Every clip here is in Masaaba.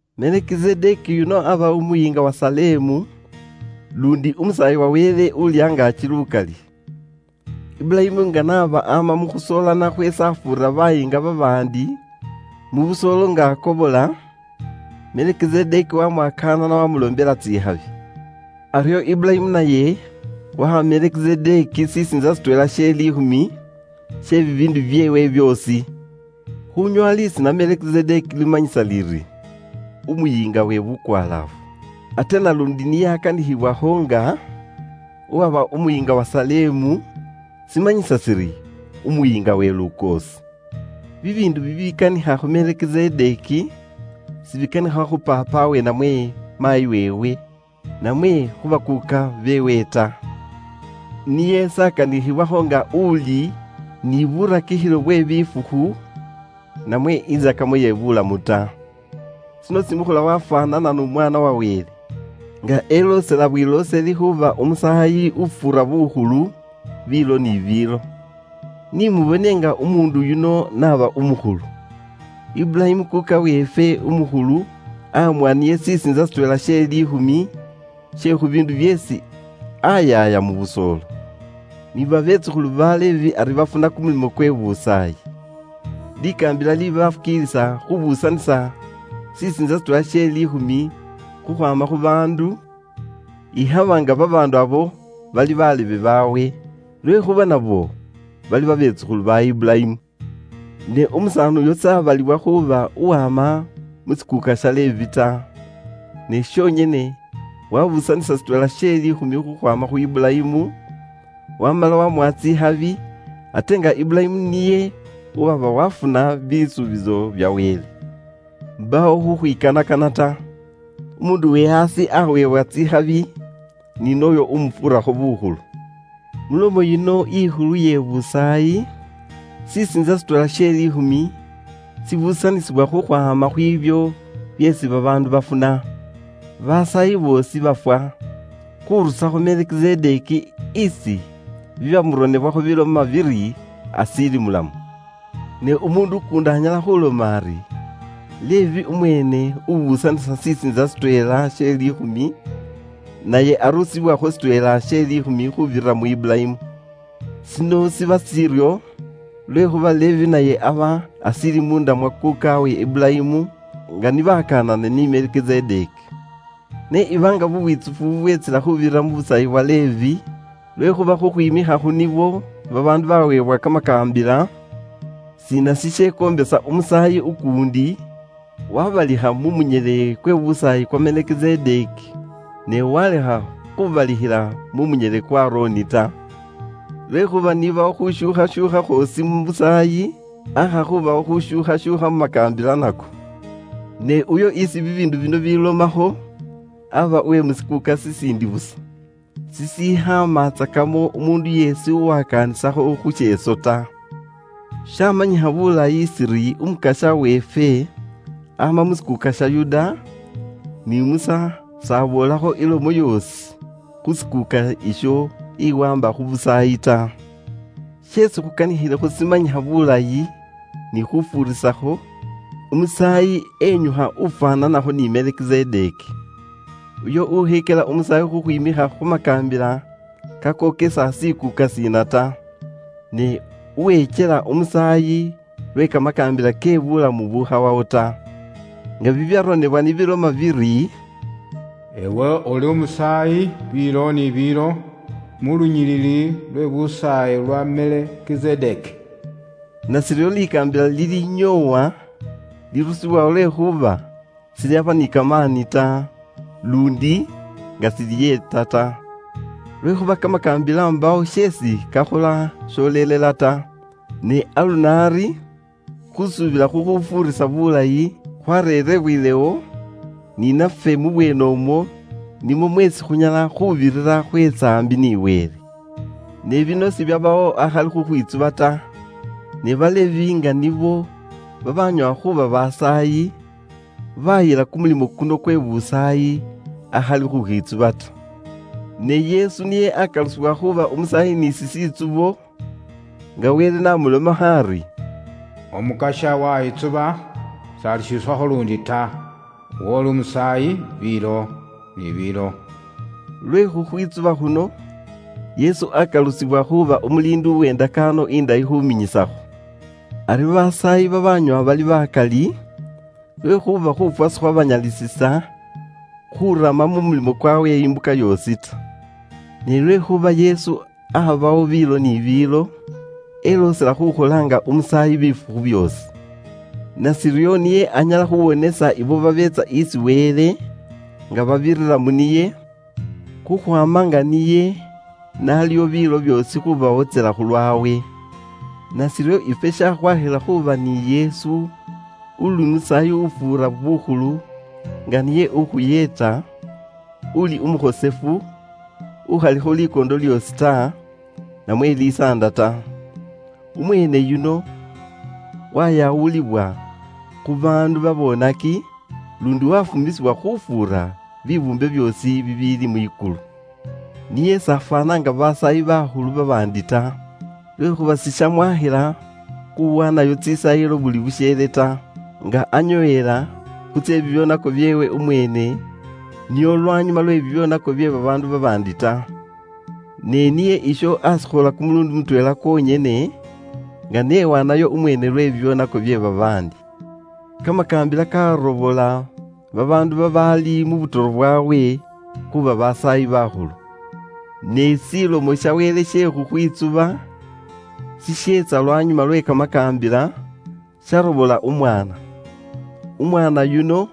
Melikizedeki yuno aaba umuyiinga wa Salemu, luundi umusaayi wa Wele Uuli angaaki lukali. Iburayimu nga n'aba ama mu khusoolana khweesi afuurira bayiinga babaandi mu busoolo nga akobola, Melekizedeki wamwakanana waamuloombela tsikhabi. Aryo Iburayimu naye waha Melekizedeki shisiintsa shitweela she liikhumi she bibiindu byeewe byoosi. Khuunyoowa lisiina Melekizedeki limanyisa liri, “Umuyiinga we Bukwalaafu,” ate naluundi niye akanikhibwakho nga uwaba umuyiinga wa Salemu, shimanyisa shiri “Umuyiinga we lukoosi.” Bibiindu bibikanikha khu Melikizedeki, sibikanikha khu paapawe namwe maayi weewe, namwe khu bakuuka beewe ta. Niye s'akanikhibwakho nga uli ni burakikhilo bwe bifukhu, namwe intsakamo ye buulamu ta. Shino shimukhola wafwaanana n'Umwaana wa Wele, nga eloosela bwilooseli khuuba umusaayi ufuura bukhulu biilo ni biilo. Ni mubone nga umuundu yuno n'aba umukhulu! Iburayimu kuuka weefwe umukhulu amuwa niye shisiintsa shitweela she liikhumi she khu biindu byeesi ayaaya mu busoolo. Ni babetsukhulu ba Levi ari bafuna kumulimo kwe busaayi. Likaambila libafukiilisa khubuusanisa shisiintsa shitweela she liikhumi khukhwaama khu baandu, ikhaba nga babaandu ibo bali be buulebe ni nabo, lwekhuuba nabo bali babetsukhulu ba Iburayimu. Ne umusaani yuno s'abaliwa khuuba uwama mu shikuuka sha Levi ta, ne shonyene wabuusanisa shitweela she liikhumi khukhwaama khu Iburayimu, wamala wamuwa tsikhabi, ate nga Iburayimu niye uwaba wafuna bisuubiso bya Wele. Mbaawo khukhwikanakana ta. Umuundu uwe aasi aweebwa tsikhabi ni nooyo umufuurakho bukhulu. Mulomo yino ikhulu iye busaayi, shisiintsa shitweela she liikhumi shibuusanisibwa khukhwaama khwiibyo byeesi babaandu bafuna. Basaayi boosi bafwa, khurusakho Melekizedeki isi bibyamuronebwakho biloma biri ashiili mulamu. Ne umuundu ukuundi anyala khuloma ari Levi umweene ubuusanisa shisiintsa shitweela she liikhumi, naye arusibwakho shitweela she liikhumi khuubirira mu Iburayimu. Shino shiba shiryo lwekhuuba Levi naye aba ashiili munda mwa kuukawe Iburayimu nga ni bakanana ni Melekizedeki. Ne iba nga bubwitsufu bubweetsila khuubirira mu busaayi bwa Levi, (lwekhuuba khukhwimikha khu nibwo babaandu baweebwa kamakaambila), shiina shishekoombisa umusaayi ukuundi wabalikhila mu munyele kwe busaayi kwa Melekizedeki, ne walekha khubalikhila mu munyele kwa Aroni ta? Lwekhuuba niibawo khushuukhashuukha khwoosi mu busaayi, aakha khuubawo khushuukhashuukha mu makaambila nako. Ne uyo isi bibiindu bino bilomakho aaba uwe mu shikuuka shiindi busa, shishikhaamatsakamo umuundu yeesi uwakaanisakho khu sheeso ta. Shamanyikha bulayi shiri Umukasya weefwe ama mu shikuuka sha Yuda, ni Musa s'aboolakho ilomo yoosi khu shikuuka isho iwaamba khu busaayi ta. Sheesi khukanikhilekho shimanyikha bulayi ni khufuurisakho; Umusaayi enyukha ufwaananakho ni Melekizedeki. Uyo ukhekyela umusaayi khukhwimikha khu makaambila kakokesa shikuuka shiina ta, ne uwekyela umusaayi lwe kamakaambila ke buulamu bukhawawo ta. Nga bibyaronebwa ni biloma biri, “Iwe uli umusaayi biilo ni biilo, mu lunyilili lwe busaayi lwa Melekizedeki.” Nashiryo likaambila lilyanyoowa lirusibwawo lwekhuuba shilyaba ni kamaani ta, luundi nga shiliyeeta ta. Lwekhuuba kamakaambila mbaawo sheesi kakhola sholelela ta, ne aluno ari, khusuubila khukhufuurisa bulayi khwareerebwelewo, ni nafwe mu bweene umwo nimwo mweesi khunyala khuubirira khweetsa aambi ni Wele. Ne bino sibyabawo akhali khukhwitsuba ta. Ne Balevi nga nibo babanyoowa khuuba basaayi, bayila kumulimo kuno kwe busaayi akhali khukhwitsuba ta. Ne Yesu niye akalusibwa khuuba Umusaayi ni shishitsubo, nga Wele n'amulomakho ari, “Umukasya wayitsuba, s'alishuusakho luundi ta, iwe uli Umusaayi biilo ni biilo.” Lwe khukhwitsuba khuno, Yesu akalusibwa khuuba umuliindi uwe ndakaano indayi khuminyisakho. Ari basaayi babanyoowa bali bakali, lwekhuuba khuufwa sikhwabanyalisisa khurama mu mulimo khwawe imbuka yoosi ta. Ne lwekhuuba Yesu abawo biilo ni biilo, eloosela khukhola nga umusaayi bifukhu byoosi. Nashiryo niye anyala khuwonesa ibo babeetsa isi Wele nga babira mu niye, khukhwaama nga niye n'aliwo biilo byoosi khubawotsela khulwawe. Nashiryo ifwe shakhwakhila khuuba ni Yesu uli Umusaayi ufuura bukhulu nga niye ukhuyeeta, uli umukhosefu, ukhalikho likoondo lyoosi ta, namwe lisaanda ta. Umweene yuno wayawulibwa khu baandu babonaki, luundi wafumisibwa khufuura bibuumbe byoosi bibiili mwikulu. Niye s'afwaana nga basaayi bakhulu babaandi ta, lwekhuuba sishamwakhila khuwaanayo tsisaayilo buli busheele ta, nga anyoowela khu tse bibyoonako byeewe umweene nio lwanyuma lwe bibyoonako bye babaandu babaandi ta. Ne niye isho ashikhola kumuluundi mutweela kwonyene nga n'ewaanayo umweene lwe bibyoonako bye babaandi. Kamakaambila karobola babaandu babaali mu butoro bwaabwe khuuba basaayi bakhulu. Ne Ilomo ya Wele iye khukhwitsuba iyeetsa lwanyuma lwe kamakaambila, yarobola Umwaana. Umwaana yuno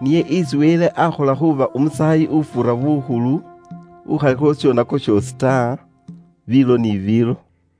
niye isi Wele aakhola khuuba umusaayi ufuura bukhulu, ukhalikho shishoonako shoosi ta, biilo ni biilo.